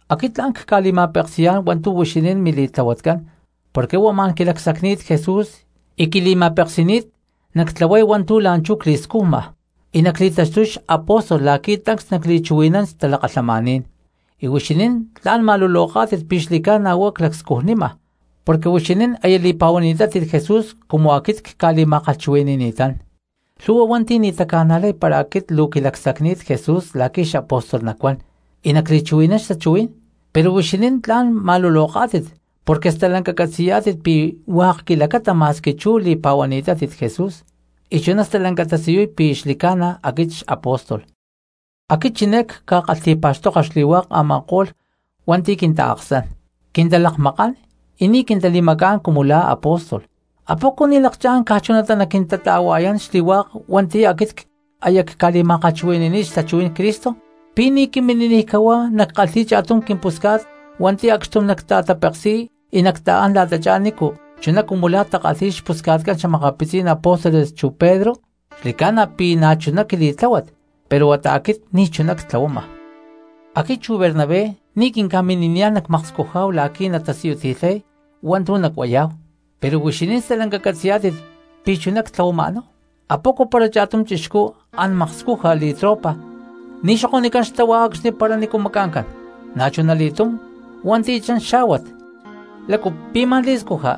Aquit tla̠n cca̠li̠ma̠peksi̠yá̠n hua̠ntu̠ huixinín mili̠tlahuatcán porque huá ma̠n quintasiyunini̠t Jesús y quili̠ma̠peksi̠ni̠t nactlahuay hua̠ntu̠ la̠nchú cli̠scujma y nacli̠taxtuy xapóstol la̠qui̠ tancs nacli̠chuhui̠nán xtalakalhamaní̠n; y huixinín tla̠n ma̠luloká̠tit pi̠ xli̠ca̠na huá clacscujnima porque huixinín aya li̠pa̠huaná̠tit Jesús cumu aquit cca̠li̠ma̠kalhchuhui̠ni̠tán. Lhu̠hua hua̠nti̠ ni̠ taca̠najlay para aquit luu quilacsacni̠t Jesús la̠qui̠ xapóstol nacuán y nacli̠chuhui̠nán xtachuhuí̠n, pero huixinín tla̠n ma̠luloká̠tit porque stalanca catzi̠yá̠tit pi̠ hua̠k quilacata ma̠squi chú li̠pa̠huaná̠tit Jesús y chuná stalanca tasiyuy pi̠ xli̠ca̠na aquit xapóstol. Aquit chiné cca̠kalhti̠pa̠xtoka xli̠hua̠k a̠ma̠ko̠lh hua̠nti̠ quintaaksán, quintalakmakán y ni̠ quintali̠macá̠n cumu la̠ apóstol: ¿Apoco ni̠ lakchá̠n caj chunatá naquintata̠hua̠yán xli̠hua̠k hua̠nti̠ aquit aya cca̠li̠ma̠kalhchuhui̠ni̠ni̠t xtachuhuí̠n Cristo? ¿Pi̠ ni̠ quimini̠niy cahuá nackalhi̠y cha̠tum quimpusca̠t hua̠nti̠ acxtum nacta̠tapeksi̠y y nacta̠án la̠tachá nícu, chuná cumu la̠ takalhi̠y xpusca̠tcán xa̠makapitzí̠n apóstoles chu Pedro? Xli̠ca̠na pi̠ na̠ chuná quili̠tláhuat, pero huata aquit ni̠chuná ctlahuama. Aquit chu Bernabé ni̠ quinca̠mini̠niyá̠n nacmakscujá̠hu la̠qui̠ natasiyuti̠lhay hua̠ntu̠ nacuayá̠hu, pero huixinín stalanca catzi̠yá̠tit pi̠ chuná ctlahuama̠náhu. ¿Apoco para cha̠tum chixcú an makscuja li̠tropa ni̠ xokonicán xtahuá acxni̠ para nícu maca̠ncán? Na̠chunali̠túm hua̠nti̠ chan xá̠huat, ¿lácu pi̠ ma̠n li̠scuja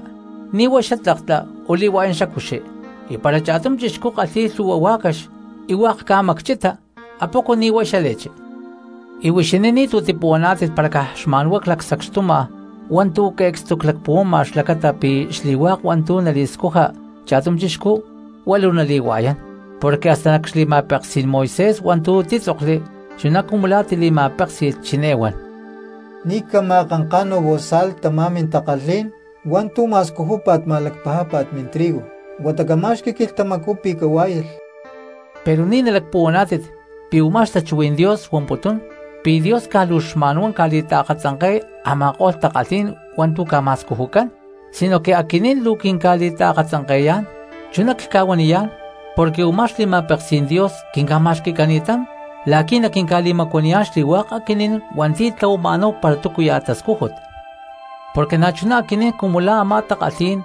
y ni̠ huay xatlaktla o li̠hua̠yán xacuxi? Y para cha̠tum chixcú kalhi̠y lhu̠hua huá̠cax y hua̠k ca̠makchita, ¿apoco ni̠ huay xaleche? Y huixinín ni̠tu̠ tipuhuaná̠tit para caj xma̠nhuá clacsacxtuma hua̠ntu̠ que̠cstu clacpuhuama xlacata pi̠ xli̠hua̠k hua̠ntu̠ nali̠scuja cha̠tum chixcú huá luu nali̠hua̠yán, porque hasta nac xli̠ma̠peksí̠n Moisés hua̠ntu̠ títzokli, chuná cumu la̠ tili̠ma̠péksi̠lh chiné huan: “Ni̠ cama̠kankanu bozal tamá mintakalhí̠n hua̠ntu̠ ma̠scujúpa̠t ma̠lacpajápa̠t mintrigo, huata cama̠xqui quilhtamacú pi̠ cahuá̠yalh.” Pero ni̠ nalacpuhuaná̠tit pi̠ u̠má xtachuhuí̠n Dios huamputún pi̠ Dios caj luu xma̠nhuá ca̠li̠taakatzanke̠y a̠ma̠ko̠lh takalhí̠n hua̠ntu̠ ca̠ma̠scujucán, sinoque aquinín luu quinca̠li̠taakatzanke̠yá̠n. Chuná cca̠huaniyá̠n porque u̠má xli̠ma̠peksí̠n Dios quinca̠ma̠xqui̠cani̠tán la̠qui̠ naquinca̠li̠macuaniyá̠n xli̠hua̠k aquinín cristianos hua̠nti̠ tlahuama̠náhu para túcuya̠ tascújut. Porque na̠chuná aquinín cumu la̠ a̠má takalhí̠n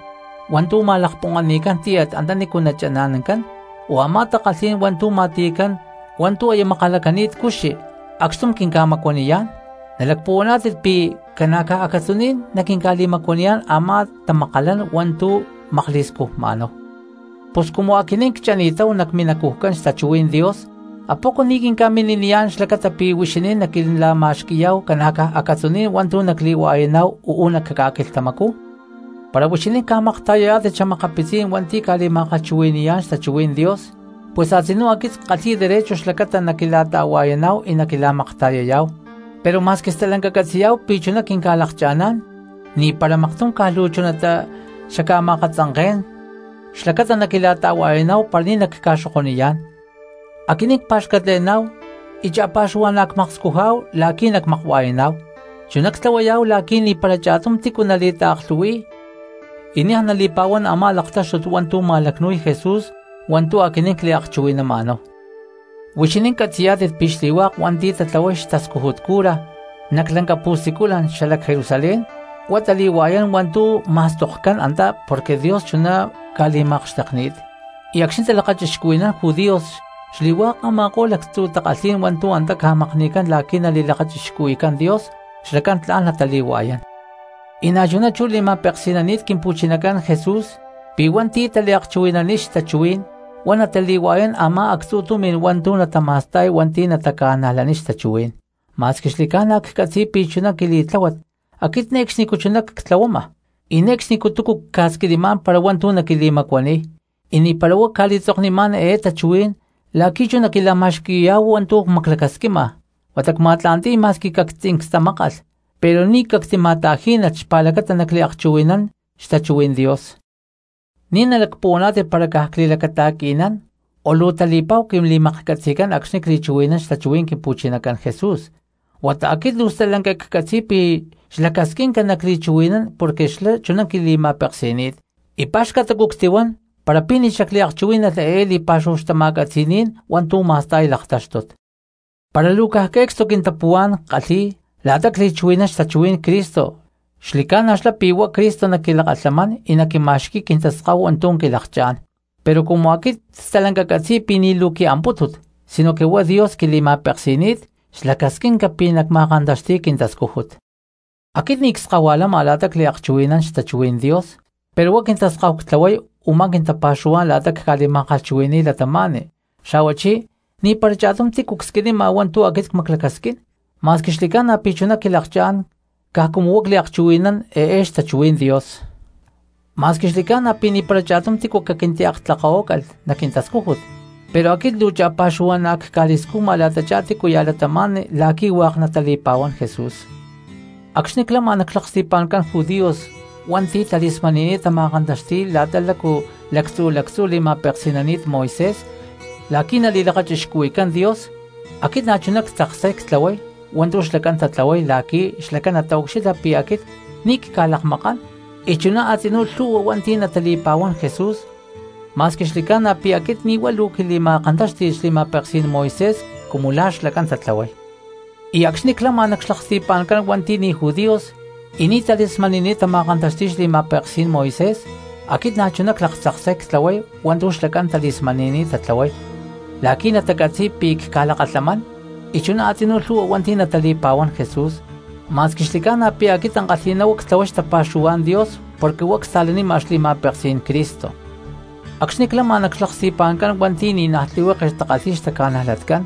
hua̠ntu̠ ma̠lakponkani̠cán tíyat antanícu nachana̠nancán o a̠má takalhí̠n hua̠ntu̠ ma̠tiyi̠cán hua̠ntu̠ aya namakalacán cuxi acxtum quinca̠mini̠niyá̠n nalacpuhuaná̠hu pi̠ ca̠na̠caj acatzuní̠n naquinca̠ma̠hui̠cán a̠má tamakalán hua̠ntu̠ makli̠scujma̠náhu. Pus cumu aquinín cchani̠táhu nac minacujcán xtachuhuí̠n Dios, ¿apoco ni̠ quinca̠mini̠niyá̠n xlacata pi̠ huixinín naquila̠ma̠xqui̠yá̠hu ca̠na̠caj acatzuní̠n hua̠ntu̠ nacli̠hua̠yaná̠hu uú nac ca̠quilhtamacú? Para huixinín ca̠makta̠yayá̠tit xa̠makapitzí̠n hua̠nti̠ ca̠li̠ma̠kalhchuhui̠ni̠yá̠n xtachuhuí̠n Dios, pus a̠tzinú aquinín ckalhi̠yá̠hu derecho xlacata naquila̠ta̠hua̠yaná̠hu y naquila̠makta̠yayá̠hu. Pero ma̠squi stalanca ccatzi̠yá̠hu pi̠ chuná quinca̠lakcha̠ná̠n ni̠para maktum caj luu chunatá xacca̠ma̠akatzanké̠n xlacata naquila̠ta̠hua̠yaná̠hu para ni̠ nacca̠xokoniyá̠n, aquinín cpa̠xcatle̠ná̠hu y cha̠pa̠xuhua̠na̠ cmakscujá̠hu la̠qui̠ nacmakua̠yaná̠hu, chuná ctlahuayá̠hu la̠qui̠ ni̠para cha̠tum tícu nali̠taaklhu̠hui̠y y niaj nali̠pa̠huán a̠má laktáxtut hua̠ntu̠ ma̠lacnu̠y Jesús hua̠ntu̠ aquinín cliakchuhui̠naná̠hu. Huixinín catzi̠yá̠tit pi̠ xli̠hua̠k hua̠nti̠ tatlahuay xtascújut cura nac lanca pu̠siculan xalac Jerusalén huá tali̠hua̠yán hua̠ntu̠ ma̠stokcán antá porque Dios chuná ca̠li̠makxtekni̠t, y acxni̠ talakachixcuhui̠nán judíos xli̠hua̠k a̠ma̠ko̠lh lactzu̠ takalhí̠n hua̠ntu̠ antá ca̠makni̠cán la̠qui̠ nali̠lakachixcuhui̠cán Dios xlacán tla̠n natali̠hua̠yán. Y na̠chuná chú li̠ma̠peksi̠nani̠t Quimpu̠chinacán Jesús pi̠ hua̠nti̠ taliakchuhui̠naniy xtachuhuí̠n huá natali̠hua̠yán a̠má actzu̠ tumi̠n hua̠ntu̠ natama̠sta̠y hua̠nti̠ nataca̠najlaniy xtachuhuí̠n. Ma̠squi xli̠ca̠na ccatzi̠y pi̠ chuná quili̠tláhuat, aquit ne̠cxnicú chuná ctlahuama, y ne̠cxnicú túcu cca̠squinimá̠n para hua̠ntu̠ naquili̠macuaniy, y na̠ ni̠para huá cca̠li̠tzoknimá̠n eé tachuhuí̠n la̠qui̠ chú naquila̠ma̠xquí̠hu hua̠ntu̠ cmaclacasquima. ¡Huata cma̠tla̠nti̠y ma̠squi cactzincstamákalh pero ni̠ cactima̠ta̠jí̠nalh xpa̠lacata nacliakchuhui̠nán xtachuhuí̠n Dios! Ni̠ napuhuaná̠tit para caj cli̠lacata̠qui̠nán o luu tali̠pa̠hu quimaklhcatzi̠cán acxni̠ cli̠chuhui̠nán xtachuhuí̠n Quimpu̠chinacán Jesús; huata aquit luu stalanca ccatzi̠y pi̠ xafuerza nacliakchuhui̠nán porque xlá chuná quili̠ma̠peksi̠ni̠t. ¡Y pa̠xcatacú ctihuán para pi̠ ni̠ xacliakchuhuí̠nalh eé li̠pa̠xúhu xtama̠catzi̠ní̠n hua̠ntu̠ ma̠sta̠y laktáxtut! Para luu caj que̠cstu quintapuhuá̠n ckalhi̠y la̠ta cli̠chuhui̠nán xtachuhuí̠n Cristo xli̠ca̠na xlá pi̠ huá Cristo naquilakalhamán y naquima̠xqui̠y quintaskahu hua̠ntu̠ quilakchá̠n; pero cumu aquit stalanca ccatzi̠y pi̠ ni̠ luu quiampútut sinoque huá Dios quili̠ma̠peksi̠ni̠t, xafuerza pi̠ nacma̠kantaxti̠y quintascújut. Aquit ni̠ cskahualama la̠ta cliakchuhui̠nán xtachuhuí̠n Dios pero huá quintaskáhu ctlahuay u̠má quintapa̠xuhuá̠n la̠ta cca̠li̠ma̠kalhchuhui̠ni̠y cristianos, xa̠huachí ni̠para cha̠tum tícu csquinima hua̠ntu̠ aquit cmaclacasquín ma̠squi xli̠ca̠na pi̠ chuná quilakchá̠n caj cumu huá cliakchuhui̠nán eé xtachuhuí̠n Dios. Ma̠squi xli̠ca̠na pi̠ ni̠para cha̠tum tícu caquintiaktlakahuácalh nac quintascújut, pero aquit luu cha̠pa̠xuhua̠na̠ cca̠li̠scuja la̠tachá tícuya̠ cristianos la̠qui̠ hua̠k natali̠pa̠huán Jesús. Acxni̠ clama nac xlaksti̠pa̠ncán judíos hua̠nti̠ tali̠smani̠ni̠t tama̠kantaxti̠y la̠ta túcu lactzu̠ lactzú li̠ma̠peksi̠nani̠t Moisés la̠qui̠ nali̠lakachixcuhui̠cán Dios, aquit na̠chuná ctzaksay ctlahuay hua̠ntu̠ xlacán tatlahuay la̠qui̠ xlacán nataucxilha pi̠ aquit ni̠ cca̠lakmakán y chuná a̠tzinú lhu̠hua hua̠nti̠ natali̠pa̠huán Jesús, ma̠squi xli̠ca̠na pi̠ aquit ni̠ huá luu quili̠ma̠kantáxti̠t xli̠ma̠peksí̠n Moisés cumu la̠ xlacán tatlahuay. Y acxni̠ clama nac xlaksti̠pa̠ncán hua̠nti̠ ni̠ judíos y ni̠ tali̠smani̠ni̠t tama̠kantaxti̠y xli̠ma̠peksí̠n Moisés, aquit na̠chuná claktzaksay ctlahuay hua̠ntu̠ xlacán tali̠smani̠ni̠t tatlahuay la̠qui̠ natacatzi̠y pi̠ cca̠lakalhamán y chuná a̠tzinú lhu̠hua hua̠nti̠ natali̠pa̠huán Jesús, ma̠squi xli̠ca̠na̠ pi̠ aquit ankalhi̠ná huá ctlahuay xtapa̠xuhuá̠n Dios porque huá csta̠lanima xli̠ma̠peksí̠n Cristo. Acxni̠ clama nac xlaksti̠pa̠ncán hua̠nti̠ ni̠naj tlihueke takalhi̠y xtaca̠najlatcán,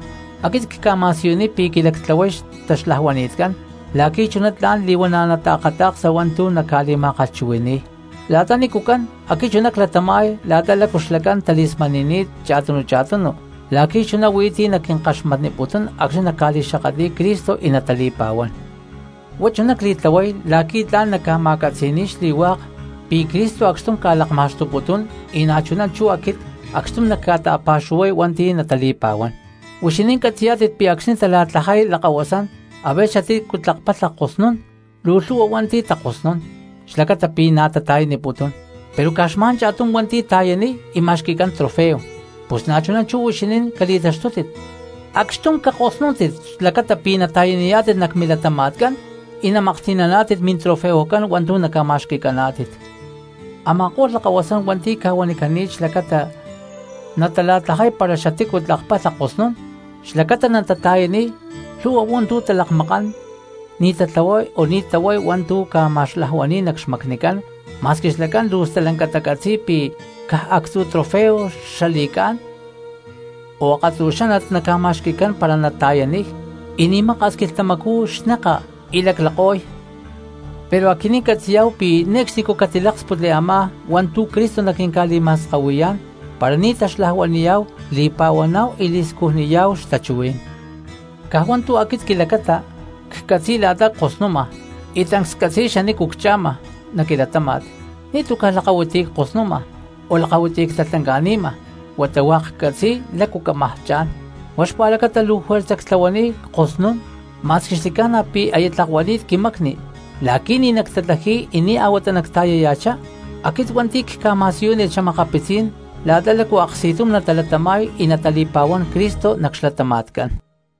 aquit cca̠ma̠siyuniy pi̠ quilá ctlahuay xtaxlajuanitcán la̠qui̠ chuná tla̠n li̠huana̠ nataakata̠ksa hua̠ntu̠ nacca̠li̠ma̠kalhchuhui̠ni̠y. La̠ta nícu can aquit chuná clatama̠y la̠ta lácu xlacán tali̠smani̠ni̠t cha̠tum cha̠tum la̠qui̠ chuná huí ti̠ naquintakaxmatniputún acxni̠ nacca̠li̠xakatli̠y Cristo y natali̠pa̠huán. Huá chuná cli̠tlahuay la̠qui̠ tla̠n nacca̠ma̠catzi̠ni̠y xli̠hua̠k cristianos pi̠ Cristo acxtum ca̠lakma̠xtuputún y na̠chuná chú aquit acxtum nacca̠ta̠pa̠xuhuay hua̠nti̠ natali̠pa̠huán. Huixinín catzi̠yá̠tit pi̠ acxni̠ tala̠tlajay lakahuasán aver xatícu tlak palha kosnún, luu lhu̠hua hua̠nti̠ takosnú̠n xlacata pi̠ na̠ tata̠yaniputún, pero caj xma̠n cha̠tum hua̠nti̠ ta̠yaniy y ma̠xqui̠cán trofeo; pus na̠chuná chú huixinín cali̠taxtútit acxtum cakosnúntit xlacata pi̠ nata̠yaniyá̠tit nac milatama̠tcán y namaklhti̠naná̠tit mintrofeojcán hua̠ntu̠ naca̠ma̠xqui̠caná̠tit. Ama̠ko̠lh lakahuasán hua̠nti̠ ca̠huanicani̠t xlacata natala̠tlajay para xatícu tlak palha kosnún, xlacata natata̠yaniy lhu̠hua hua̠ntu̠ talakmakán ni̠ tatlahuay o ni̠ tahuay hua̠ntu̠ ca̠ma̠xlajuani̠y nac xmacnicán ma̠squi xlacán luu stalanca tacatzi̠y pi̠ caj actzu̠ trofeo xla li̠cá̠n o akatzu̠ xánat naca̠ma̠xqui̠cán para nata̠yaniy y ni̠ maka̠s quilhtamacú xneka y laclako̠y; pero aquinín catzi̠yá̠hu pi̠ ne̠cxnicú catiláksputli a̠má hua̠ntu̠ Cristo naquinca̠li̠ma̠skahui̠yá̠n para ni̠ taxlajuani̠yá̠hu li̠pa̠huaná̠hu y li̠scujniyá̠hu xtachuhuí̠n. Caj hua̠ntu̠ aquit quilacata ccatzi̠y la̠ta ckosnuma y tancs ccatzi̠y xanícu ccha̠ma nac quilatáma̠t, ni̠tu̠ caj lakahuiti ckosnuma o lakahuiti ctatlanca̠ni̠ma huata hua̠k ccatzi̠y lácu cámaj cha̠n. Huá xpa̠lacata luu juerza ctlahuaniy ckosnún ma̠squi xli̠ca̠na pi̠ aya tlakuani̠t quimacni la̠qui̠ ni̠ nactatlaji̠y y ni̠ a̠huatá nacta̠yaya̠chá aquit hua̠nti̠ cca̠ma̠siyúnilh xa̠makapitzí̠n cristianos la̠ta lácu aksti̠tum natalatama̠y y natali̠pa̠huán Cristo nac xlatama̠tcán.